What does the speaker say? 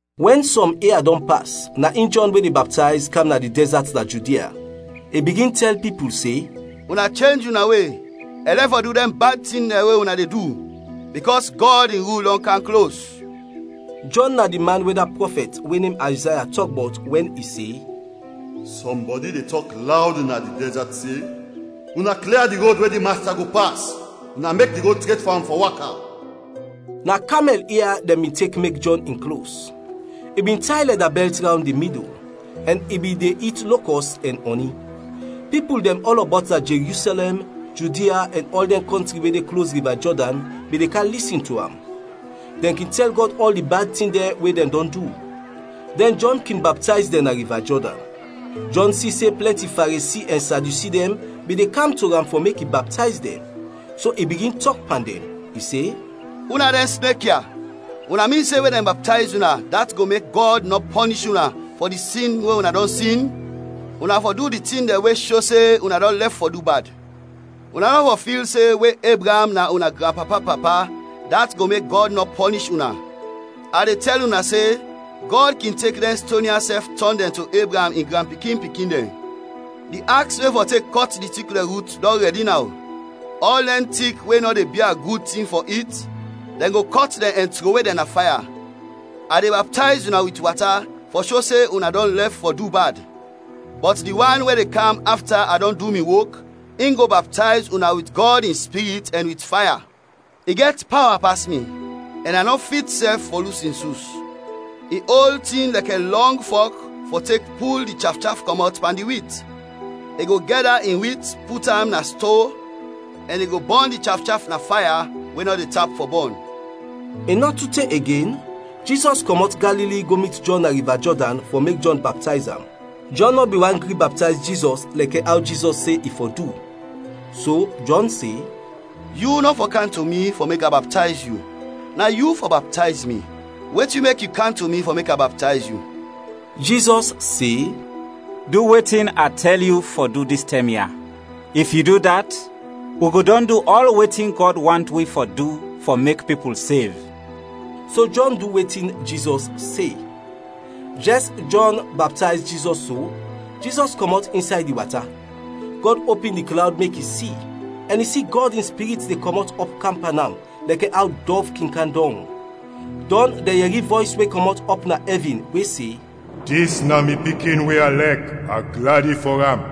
Wɛn sɔm ia dɔn pas na in Jɔn we de baptayz kam na di dɛzat na Judia. I bigin tɛl pipul se, “Una chenj una we ɛn lɛf fɔ du di bad tin dɛn we una de du, bikɔs Gɔd in rul dɔn kam klos!” Jɔn na di man we da prɔfɛt we nem Ayzaya tɔk bɔt wɛn i se, “Sɔmbɔdi de tɔk lawd na di dɛzat se, ‘Una klia di rod we di Masta go pas; una mek di rod tret fɔ am fɔ waka!’” Na kamɛl ia dɛn bin tek mek Jɔn in klos, i bin tay lɛda bɛlt rawnd in midul, ɛn i bin de it lokɔs ɛn ɔni. Pipul dɛn ɔlɔbɔt na Jerusɛlɛm, Judia, ɛn ɔl dɛn kɔntri we de klos Riva Jɔdan bin de kam lisin to am. Dɛn kin tɛl Gɔd ɔl di bad tin dɛn we dɛn dɔn du, dɛn Jɔn kin baptayz dɛn na Riva Jɔdan. Jɔn si se plɛnti Faresi ɛn Sadyusi dɛn bin de kam to am fɔ mek i baptayz dɛn, so i bigin tɔk pan dɛn. I se, “Una dɛn snek ya, una min se we dɛn baptayz una dat go mek Gɔd nɔ pɔnish una fɔ di sin we una dɔn sin? Una fɔ du di tin dɛn we sho se una dɔn lɛf fɔ du bad. Una nɔ fɔ fil se, we Ebraam na una granpapa-papa dat go mek Gɔd nɔ pɔnish una. A de tɛl una se Gɔd kin tek dɛn ston ya sɛf tɔn dɛn to Ebraam in granpikin-pikin dɛn! Di aks we fɔ tek kɔt di tik dɛn rut dɔn rɛdi naw; ɔl dɛn tik we nɔ de bia gud tin fɔ it, dɛn go kɔt dɛn ɛn trowe dɛn na faya. A de baptayz una wit wata fɔ sho se una dɔn lɛf fɔ du bad, bɔt di wan we de kam afta a dɔn du mi wok, in go baptayz una wit Gɔd in Spirit ɛn wit faya. I gɛt pawa pas mi, ɛn a nɔ fit sɛf fɔ lus in sus. I ol tin lɛkɛ lɔng fɔk fɔ tek pul di chafchaf kɔmɔt pan di wit. I go gɛda in wit put am na sto ɛn i go bɔn di chafchaf na faya we nɔ de tap fɔ bɔn.” I nɔ tu te igen, Jizɔs kɔmɔt Galili go mit Jɔn na Riva Jɔdan fɔ mek Jɔn baptayz am. Jɔn nɔ bin want gri baptayz Jizɔs lɛkɛ aw Jizɔs se i fɔ du, so Jɔn se, “Yu nɔ fɔ kam to mi fɔ mek a baptayz yu, na yu fɔ baptayz mi. Wetin mek yu kam to mi fɔ mek a baptayz yu?” Jizɔs se, “Du wetin a tɛl yu fɔ du dis tɛm ya. If yu du dat, wi go dɔn du ɔl wetin Gɔd want wi fɔ du fɔ mek pipul sev.” So Jɔn du wetin Jizɔs se. Jɛs Jɔn baptayz Jizɔs so, Jizɔs kɔmɔt insay di wata. Gɔd opin di klawd mek i si, ɛn i si Gɔd in Spirit de kɔmɔt ɔp kam pan am lɛkɛ aw dɔv kin kam dɔng. Dɔn dɛn yɛri vɔys we kɔmɔt ɔp na ɛvin we se, “Dis na mi Pikin we a lɛk, a gladi fɔ am.”